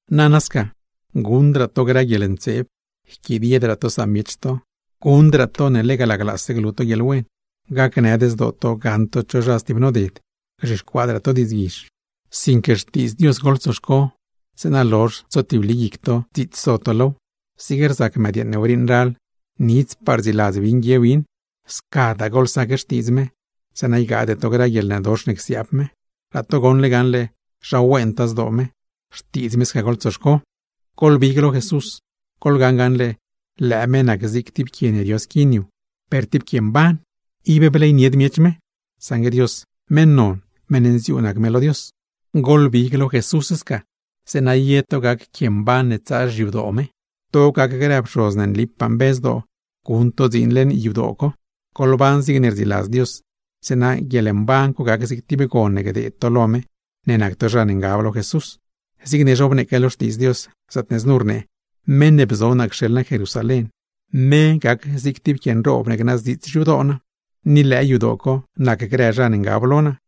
Nana sca: guṉdraa to grë guieḻntseeb, yquidiedraa to samiech to, guṉdraa to ne laglaase glu to guieḻwen, gacnëd zdoo to gaṉ to cho zha stib noded, gzhixcuaadraa to diidzguizh. Sinque Xtiidz Dios goḻtsoxco, zeeṉa lozh tsotibli guic to dziits so to low. Zig rzac mëdyeeṉ ne wriiṉ ral, nidzpaa rdziladz win guie win; scadaa goḻsac Xtiidz me, zeeṉa ygaade to grë guieḻnëdox ne csiaab me. Laa to goṉle gaṉle zha wentaa zdoo me, Xtiidz me sca goḻtsoxco. Goḻbig lo Jesús, goḻgaṉ gaṉle lëë me nac zig tib quie ne rio squin yu, per tib quie mban. Ib bleynied miech me, saṉgue Dios, meṉ non, meṉ nziuu nac me lo me. Goḻbig lo me sca, zeeṉa ye to gac quie mban ne tsaa xyadoo me. To gac grë pxoz ne nlipaa mbe zdoo, guṉ to dziin leṉ yadoo co; goḻban zigne rdziladz Dios, zeeṉa guieḻmban co gac zig tib gon ne gdeed to lo me, ne nac to zha ne ngab lo Jesús. Zigne zhobneeque lo Xtiidz Dios, zaatne znu rnee: Meṉ ne bzo naa cxeḻ naa Jerusalén, me gac zig tib quie nroob ne gnaaz dziits xyadoo naa, ni lëë yadoo co nac grë zha ne ngab lo naa.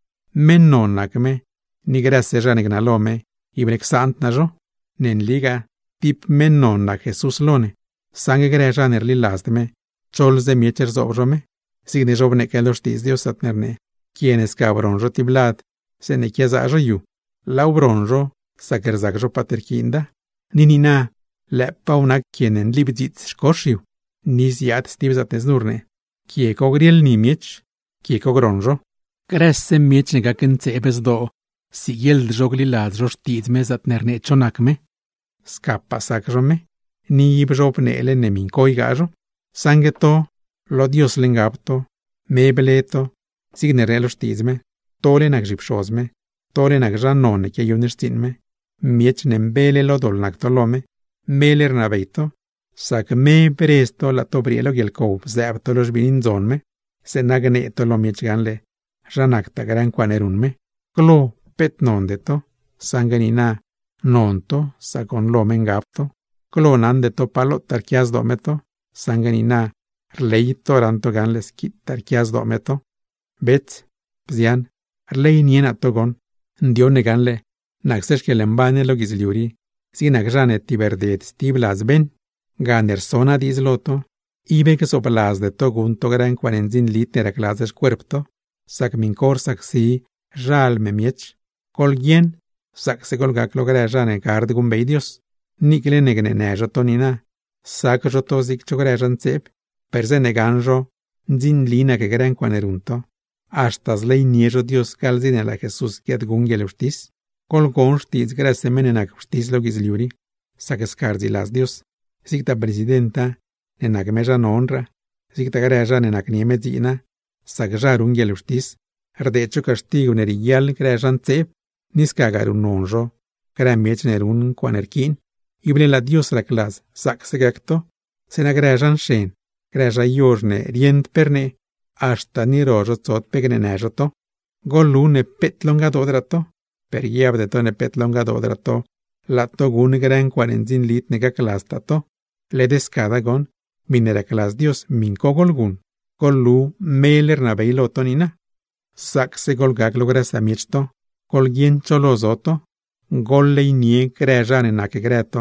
Meṉ non nac me, ni grëse zha ne gnalo me, ible csaand naa zho. Ne nligaa tib meṉ non nac me lo ne, saṉgue grë zha ne rliladzd me choḻze miech rzoob zho me; zigne zhobneeque lo Xtiidz Dios, zaatne rnee: Quie ne sca broṉ zho tib lad zeeṉe quiazaa zho yu, laaw broṉ zho sac rzac zho paat rquiinda, ni niina lëëpaaw nac quie ne nlibdziits xcox yu. Ni ziaad stib zaatne znu rnee: Quie co grieḻ ni miech, quie co groṉ zho. Grëse zha ne nëd gliladz Xtiidz me zaatne rnee cho nac me, scapaa sac zho me, ni ib zhobneele ne miṉ co ygaa zho. Saṉgue to, lo Diosle ngab to, me ble to, zigne rnee lo Xtiidz me: tole nac zhipxoz me, tole nac zha non ne quiayuṉ xtsiiṉ me; miech ne mbele lo doḻ nac to lo me, mele rnabey to sac me bredz to laa to briee lo guieḻcow bzëëb to lo xbiini ndzon me; zeeṉa gnee to lo miech gaṉle zha nactaa grë ncuaaṉe ruṉ me. Glo peet nonde to, saṉgue niina non to sac goṉ lo me ngab to; glo naṉde to pa lotaa rquia zdoo me to, saṉgue niina rley to raṉ to gaṉle squitaa rquia zdoo me to. Bets, bzian, rleynie naa to. Ndioṉ ne gaṉle, nacse xquieḻmban ne lo guidzliu rii zig zha ne tibrded stib ladz beṉ; gane rso naa diidz lo to, ib gzoobladzde to guṉ to grë ncuaaṉe ndzinlid ne racladz xcuerp to; sac miṉ co rsacsi xalm miech. Goḻguieṉ zaacse goḻgac lo grëraa zha ne gard guṉbey Dios; niicle ne gneenë zho to niina, sac zho to zig cho grë zha ntseeb, per zeeṉe gaṉ zho ne ndzinli nac grë ncuaaṉe ruṉ to, haxta zleynie zho Dios gaḻ dze ne laa Jesús guiaadguṉ guieḻwxtis. Goḻgon xtiidz grëse meṉ ne nac wxtis lo guidzliu rii, sac sca rdziladz Dios: zigtaa presidenta, ne nac me zha nonraa, zigtagaa grë zha ne nacnie me dziina, sac zha ruṉ guieḻwxtis, rdeed zho caxtigw ne rieguiaḻ grë zha ntseeb, ni scagaa ruṉnon zho grë miech ne ruṉ ncuaaṉe rquiin. Ible laa Dios racladz zaacse gac to, zeeṉa grë zha nxen, grë zha yozh ne rieṉd pe rnee, haxta ni ro zho tsod pe gneenë zho to. Goḻlu ne peet lo ngadoodraa to, per guiabde to ne peet lo ngadoodraa to laa to guṉ grë ncuaaṉe ndzinlid ne gacladztaa to. Led scada goṉ, miṉe racladz Dios miṉ co goḻguṉ, goḻlu mele rnabey to niina. Zaacse goḻgac lo grë samiech to, goḻguieṉ cho lo zo to. Goḻleynie grë zha ne nacgrë to,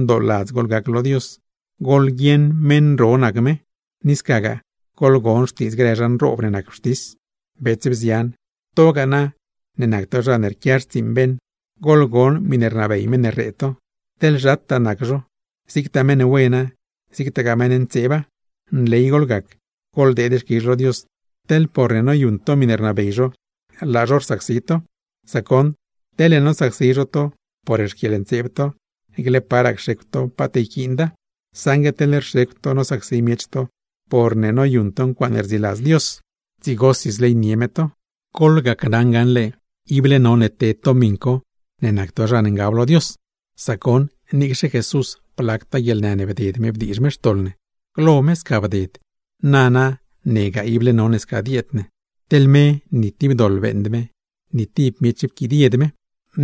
ndooladz goḻgac lo Dios, goḻguieṉ ne meṉ ro nac me; ni scagaa goḻgon xtiidz grë zha ne nac wxtis nroob. Bets, bzian, to ne nac to zha ne quia xtsiiṉ beṉ, goḻgon miṉe rnabey meṉ ne rree to; teḻ zhataa nac zho, zigtaa meṉ wena, zigtagaa meṉ ne ntseeba. ¡Nley goḻgac, goḻdeed xquizh lo Dios, teḻ porne noyuṉ to miṉe rnabey me, laa zho rsacsi to! Sac goṉ, teḻne nosacsi zho to por xquieḻntseeb to, niicle paraa cxecw to paat yquiinda; saṉgue teḻ rxecw to nosacsi miech to porne noyuṉ to ncuaaṉe rdziladz Dios, dzigosi zleynie me to. Goḻgacnaṉ gaṉle, ible none ted to miṉ co ne nac to zha ne ngab lo Dios; sac goṉ, niicxe Jesús, blactaa guieḻnë ne bded me bdiizh me xtoḻ ne. Glo me sca bded, nana negaa ible none sca dieed ne. Teḻ me ni tib doḻ beeṉd me, ni tib miech pquidied me.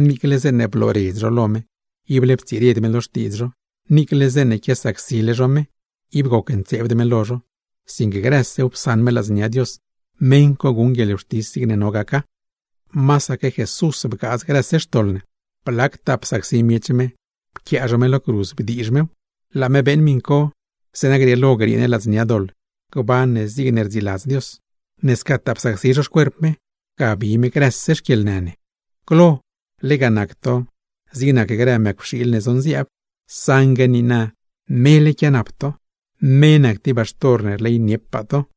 Niicle zeeṉe blooredz zho lo me, ible ptsired me lo diidz co; niicle zeeṉe quiasacsile zho me, ib gocntseebd me lo zho; sinque grësew psaṉ me ladznia Dios, meṉ co guṉ guieḻwxtis zigne no gaca. Masaque Jesús bgaadz grëse xtoḻ ne, blactaa psacsi zho me pquia me lo cruz bdiizh mew; laa me beeṉ miṉ co, zeeṉa grieelo griee ne ladznia doḻ, gban ne zigne rdziladz Dios. Ne scataa psacsi zho xcuerp me, ga bi me grëse xquieḻnë ne. Glo lega nac to zig nac grë mëcwxiil ne zonziaab, saṉgue niina mele quianap to. Me nac tib baxtor ne rleyniepaa to.